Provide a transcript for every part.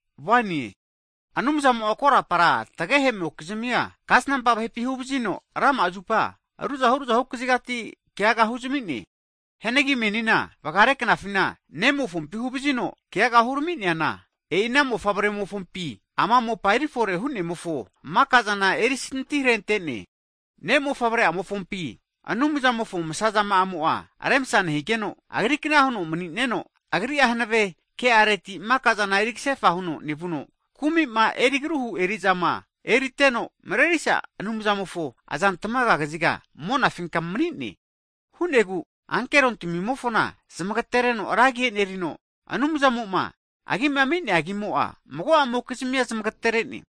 Hagi Anumzamo'a korapara tagehe'mokizmia, kasnampa vahepi huvazino hakare'a zupa ruzahu ruzahu kazigati kegaga huzami'ne. Hianagi menima vagare knafina Nemofompi huvazino keaga huramine. Hagi e'i ana Mofavre'amofo azampinti ama mopa erifore huno maka'zana erisinti harente'ne. Ne'mofavre'amofompi Anumzamofo msazama'amo'a remsa nehigeno, Agrikna huno mani'neno, Agri'a hanave ke'areti maka'zana eri kasefa huno nevuno, kumi'ma eri agruhu eri'zama eriteno, Marerisgahu Anumzamofo azantamaga kaziga monafinka mani'ne. E'ina hu'negu ankerontamimofona zmagetereno ragi e'nerigeno, Anumzamo'ma Agima ami'nea agimo'a makamokizmia zamagaterene.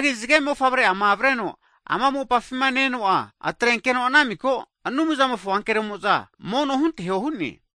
Hagi zage mofavre'ama avreno ama mopafima ne-eno'a, atrenkeno ana miko Anumzamofo ankeromo'za mono hunteho hu'ne.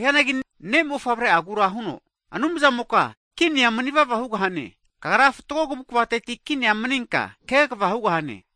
Hu'neanagi Ne' mofavre'agura huno, Anumzamoka, kinia mani'vava hugahane. Kagra fatgo kavukavateti kinia maninka kegava hugahane.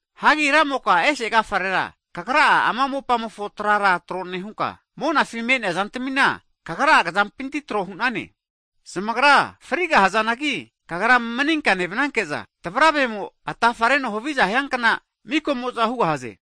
Hagi Ramoka ese agafarera Kagra'a ama mopamofo trara tro nehunka, monafi me'nea zantamina Kagra'a kazampinti trohu'nane. Zamagra frigahazanangi, Kagra maninka nevananke'za, tavravemo atafareno havizahiankna mikamo'za hugahaze.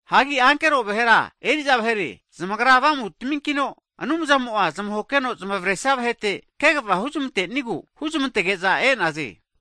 Hagi ankero vahera eri'za vahere, zamagra avamutaminkino Anumzamo'a zamahokeno zamavaresia vahete kegava huzamantenigu huzmantege'za e'naze.